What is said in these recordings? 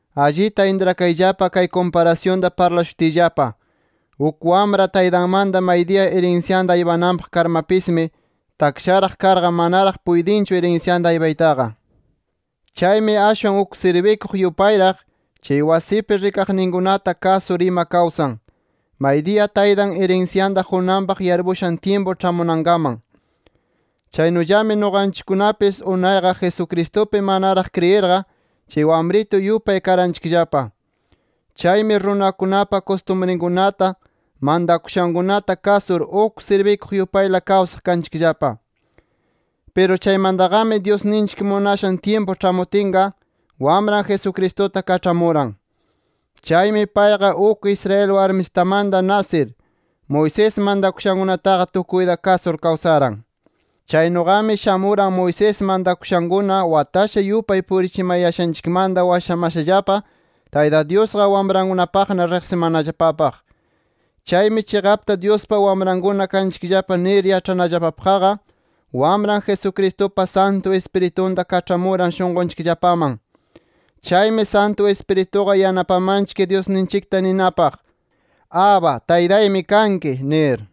Allita intrakayllapa kay kumparasyunta parlashutiyllapa. Uk wamra taytanmanta maydiya irinsyanta aypananpaq karmapismi, taksharaq karqa manaraq puytinchu irinsyanta aypaytaqa. Chaymi ashwan uk sirbikuq yupayraq, chay wasinpi rikaqninkunata kasur ima kawsan, maydiya taytan irinsyanta qunanpaq yarpushan tyimpu ĉhamunankaman. Chaynullami nuqanchikkunapis unayqa Jesucristupi manaraq kriyirqa, chay wamritu yupay karanchikllapa. Chaymi runakunapa kustumrinkunata, mantakushankunata kasur, uk sirbikuq yupayla kawsaq kanchikllapa. Piru chaymantaqami Dyusninchik munashan tyimpu ĉhamutinqa, Wamran Jesucristuta kaĉhamuran. Chaymi payqa uk Israel warmisitamanta nasir, Moisés mantakushankunataqa tukuyta kasur kawsaran. Chaynuqami shamuran Moisés mantakushankuna watasha yupay purichimayashanchikmanta washamashallapa, Tayta Dyusqa wamrankunapaqna riqsimanallapapaq. Chaymi chiqapta Dyuspa wamrankuna kanchikllapa nir yaĉhanallapapaqqa, Wamran Jesucristupa Santu Ispiritunta kaĉhamuran, shunqunchikllapaman. Chaymi Santu Ispirituqa yanapamanchik Dyusninchikta ninapaq “Abba Taytaymi kanki” nir.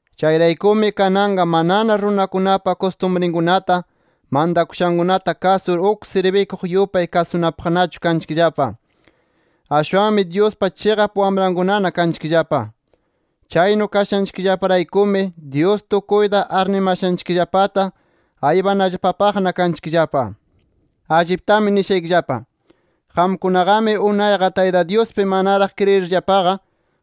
Chayraykumi kananqa manana runakunapa kustumrinkunata, mantakushankunata kasur, uk sirbikuq yupay kasunapaqnachu kanchikllapa. Ashwanmi Dyuspa chiqap wamrankunana kanchikllapa. Chaynu kashanchikllaparaykumi, Dyus tukuyta arnimashanchikllapata aypanallapapaqna kanchikllapa. Alliptami nishaykillapa: Qamkunaqami unayqa, Tayta Dyuspi manaraq kriyirllapaqa,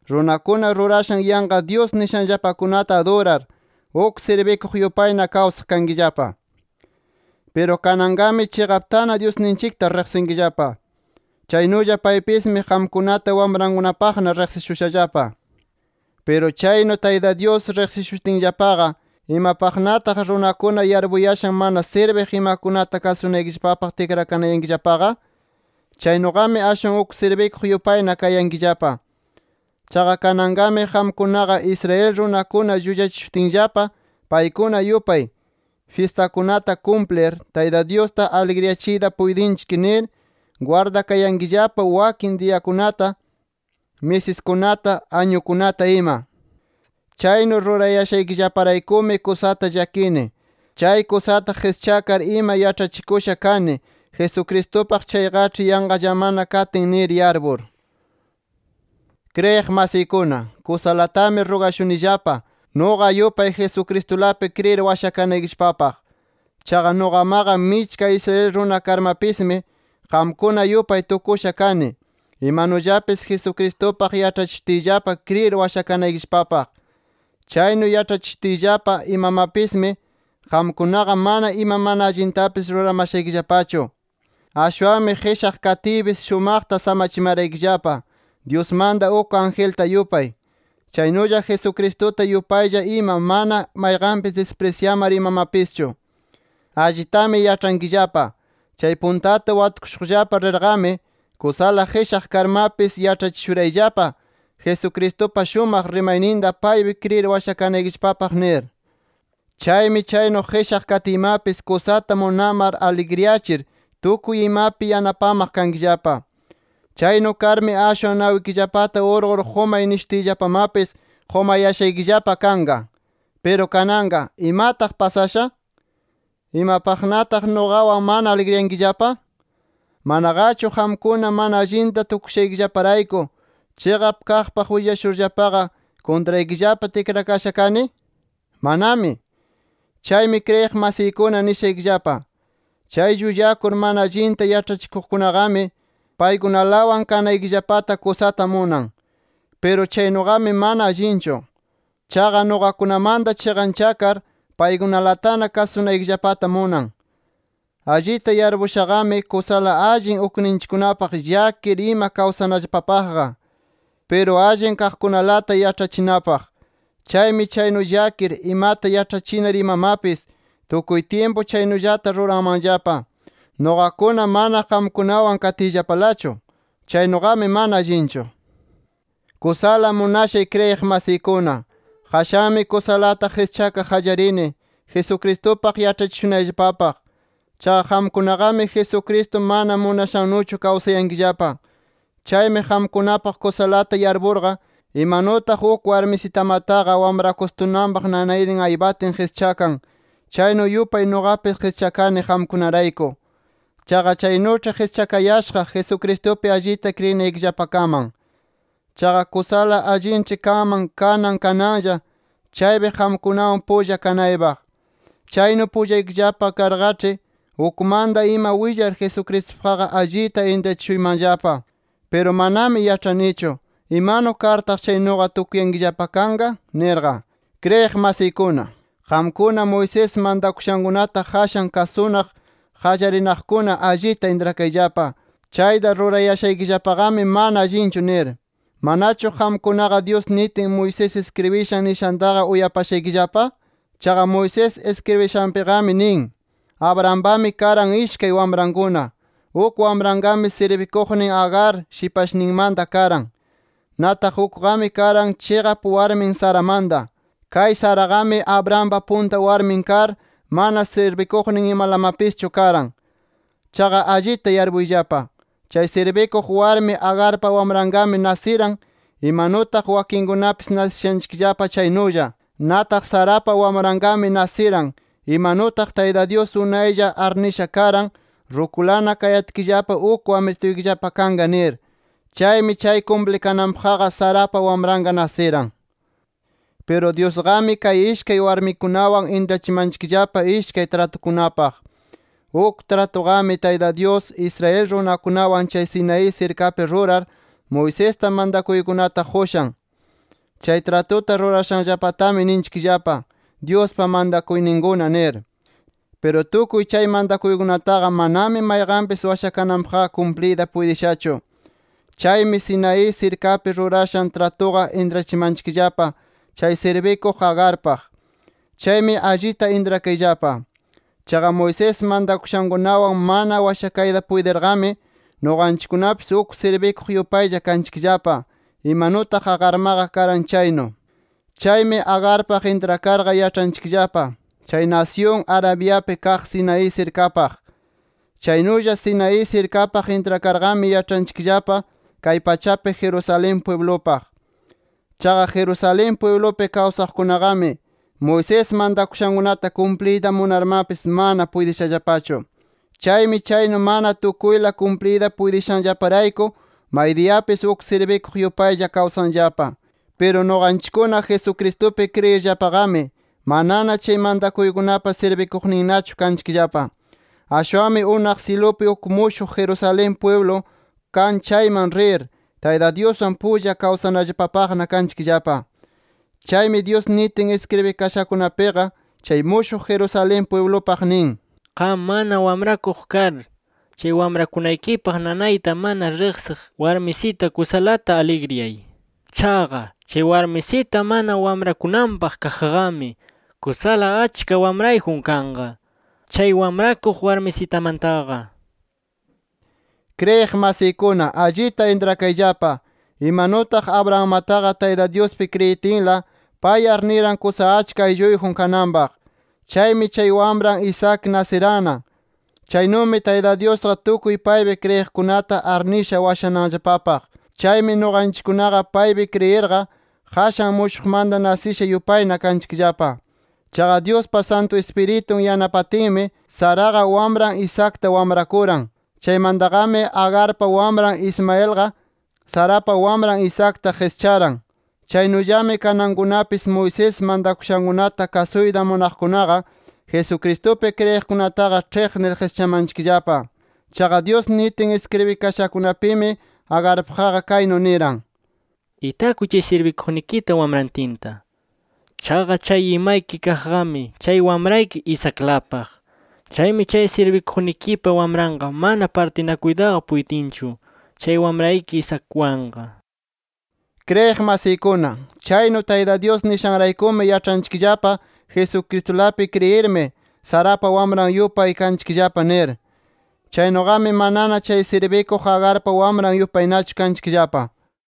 runakuna rurashan yanqa dyus nishanllapakunata adurar, uk sirbikuq yupayna kawsaq kankillapa. Piru kananqami chiqaptana Dyusninchikta riqsinkillapa. Chaynulla paypismi qamkunata wamrankunapaqna riqsishushallapa. Piru chaynu Tayta Dyus riqsishutinllapaqa, ¿imapaqnataq runakuna yarpuyashan mana sirbiq imakunata kasunaykillapapaq tikrakanayankillapaqa? Chaynuqami ashwan uk sirbikuq yupayna kayankillapa. Chaqa kananqami qamkunaqa Israel runakuna llullachishutinllapa, paykuna yupay “Fyistakunata kumplir, Tayta Dyusta aligriyachiyta puytinchik” nir, gwardayankillapa wakin diyakunata, misiskunata, añukunata, ima. Chaynu rurayashaykillaparaykumi kusata llakini, chay kusata qischakar ima yaĉhachikusha kani Jesucristupaq chayqaĉhi yanqallamana katin nir yarpur. Kriyiq masiykuna, kusalatami rugashunillapa, nuqa yupay Jesucristulapi kriyir washakanaykillapapaq. Chaqa nuqamaqa michka Israel runa karmapismi, qamkuna yupay tukusha kani, imanullapis Jesucristupaq yaĉhachishutiyllapa kriyir washakanayllapapaq. Chaynu yaĉhachishutiyllapa imamapismi, qamkunaqa mana ima mana allintapis ruramashaykillapachu. Ashwanmi qishaq katiypis, shumaqta samachimaraykillapa, Dyusmanta uk angelta yupay, chaynulla Jesucristuta yupaylla ima, mana mayqanpis disprisyamar imamapischu. Allitami yaĉhankillapa: Chay puntata watukushuqllapa rirqami, kusala qishaq karmapis, yaĉhachishurayllapa Jesucristupa shumaq rimayninta, paypi kriyir washakanaykillapapaq, nir. Chaymi chaynu qishaq katiymapis kusata munamar, aligriyachir, tukuy imapi yanapamaq kankillapa. Chaynu karmi ashwan nawikillapata urqur qumay nishutiyllapamapis, qumayashaykillapa kanqa. Piru kananqa, ¿imataq pasasha? ¿Imapaqnataq nuqawan mana aligriyankillapa? ¿Manaqachu qamkuna mana allinta tukuyashaykillaparayku, chiqap kaqpaq willashurllapaqa kuntraykillapa tikrakasha kani? ¡Manami! Chaymi kriyiq masiykuna nishaykillapa: Chay llullakur mana allinta yaĉhachikuqkunaqami, paykunalawan kanaykillapata kusata munan. Piru chaynuqami, mana allinchu. Chaqa nuqakunamanta chiqanchakar, paykunalatana kasunaykillapata munan. Allita yarpushaqami, kusala allin ukninchikkunapaq llakir ima kawsanallapapaqqa. Piru allin kaqkunalata yaĉhachinapaq. Chaymi chaynu llakir, imata yaĉhachinar imamapis tukuy tyimpu chaynullata ruranmanllapa, nuqakuna mana qamkunawan katiyllapalachu. Chaynuqami mana allinchu. Kusala munashay kriyiq masiykuna, qashanmi kusalata qischakaq qallarini, Jesucristupaq yaĉhachishunayllapapaq. Chaqa qamkunaqami Jesucristo mana munashannuchu kawsayankillapa. Chaymi qamkunapaq kusalata yarpurqa, imanutaq uk warmisitamataqa wamrakustunanpaq nanaynin aypatin qischakan, chaynu yupay nuqapis qischakani qamkunarayku. Chaqa chaynuĉhi qischakayashaq Jesucristupi allita kriyinaykillapakaman. Chaqa kusala allinĉhi kanman kanan kananlla chaypi qamkunawan pulla kanaypaq. Chaynu pullaykillapa karqaĉhi, ukmanta ima willar Jesucristupaqqa allita intrachishuymanllapa. Piru manami yaĉhanichu, ¿imanu kartaq chaynuqa tukuyankillapa kanqa? nirqa. Kriyiq masiykuna, qamkuna Moisés mantakushankunata qashan kasunaq qallarinaqkuna allita intrakayllapa, chayta rurayashaykillapaqami mana allinchu nir. ¿Manachu qamkunaqa, Dyus nitin Moisés iskribishan niyashantaqa uyapashaykillapa? Chaqa Moisés iskribishanpiqami nin: Abrahampami karan ishkay wamrankuna. Uk wamranqami sirbikuqnin Agar, shipashninmanta karan. Nataq ukqami karan chiqap warmin Saramanta. Kay Saraqami Abrahampa punta warmin kar, mana sirbikuqnin imalamapischu karan. Chaqa allita yarpuyllapa: Chay sirbikuq warmi Agarpa wamranqami nasiran, imanutaq wakinkunapis nasishanchikllapa chaynulla. Nataq Sarapa wamranqami nasiran, imanutaq Tayta Dyus unaylla arnisha karan, rukulana kayatkillapa uk wamrituykillapa kanqa nir. Chaymi chay kumplikananpaqqa Sarapa wamranqa nasiran. Piru Dyusqami kay ishkay warmikunawan intrachimanchikllapa ishkay tratukunapaq. Uk tratutaqami Tayta Dyus, Israel runakunawan chay Sinaí sirkapi rurar, Moisesta mantakuykunata qushan. Chay tratuta rurashanllapatami ninchikllapa: “Dyuspa mantakuyninkuna” nir. Piru tukuy chay mantakuykunataqa, manami mayqanpis washakananpaqqa kumpliyta puytishachu. Chaymi Sinaí sirkapi rurashan tratuqa intrachimanchikllapa chay sirbikuq Agarpaq. Chaymi allita intrakayllapa. Chaqa Moisés mantakushankunawan mana washakayta puytirqami, nuqanchikkunapis uk sirbikuq yupaylla kanchikllapa, imanutaq Agarmaqa karan chaynu. Chaymi Agarpaq intrakarqa yaĉhanchikllapa chay nasyun Arabiapi kaq Sinaí sirkapaq. Chaynulla Sinaí sirkapaq intrakarqami yaĉhanchikllapa kay pachapi Jerusalén pwiblupaq. Chaqa Jerusalén pwiblupi kawsaqkunaqami Moisés mantakushankunata kumpliyta munarmapis, mana puytishallapachu. Chaymi chaynu mana tukuyla kumpliyta puytishanllaparayku maydiyapis uk sirbikuq yupaylla kawsanllapa. Piru nuqanchikkuna Jesucristupi kriyirllapaqami, manana chay mantakuykunapa sirbikuqninnachu kanchikllapa. Ashwanmi unaq syilupi uk mushuq Jerusalén pwiblu kan chayman rir, Tayta Dyuswan pulla kawsanallapapaqna kanchikllapa. Chaymi Dyus nitin iskribikashankunapiqa, chay mushuq Jerusalén pwiblupaq nin: “Qam mana wamrakuq kar, chay wamrakunaykipaq nanayta mana riqsiq warmisita, kusalata aligriyay. Chaqa chay warmisita mana wamrakunanpaq kaqqami, kusala achka wamrayjun kanqa, chay wamrakuq warmisitamantaqa” nir. Kriyiq masiykuna allita intrakayllapa, imanutaq Abrahammataqa Tayta Dyuspi kriyitinla, pay arniran kusa achka aylluyjun kananpaq. Chaymi chay wamran Isaac nasiranna. Chaynumi Tayta Dyusqa tukuy paypi kriyiqkunata arnisha washamanallapapaq. Chaymi nuqanchikkunaqa paypi kriyirqa, qashan mushuqmanta nasisha yupayna kanchikllapa. Chaqa Dyuspa Santu Ispiritun yanapatinmi, Saraqa wamran Isaacta wamrakuran. Chaymantaqami Agarpa wamran Ismaelqa Sarapa wamran Isaacta qischaran. Chaynullami kanankunapis Moisés mantakushankunata kasuyta munaqkunaqa Jesucristupi kriyiqkunataqa ĉhiqnir qischamanchikllapa. Chaqa Dyus nitin iskribikashankunapimi Agarpaqqa kaynu niran: “Itakuy chay sirbikuqnikita wamrantinta. Chaqa chay imayki kaqqami chay wamrayki Isaaclapaq. Chaymi chay sirbikuqnikipa wamranqa mana partinakuytaqa puytinchu chay wamrayki Isaacwanqa” nir. Kriyiq masiykuna, chaynu Tayta Dyus nishanraykumi yaĉhanchikllapa Jesucristulapi kriyirmi, Sarapa wamran yupay kanchikllapa nir. Chaynuqami manana chay sirbikuq Agarpa wamran yupaynachu kanchikllapa.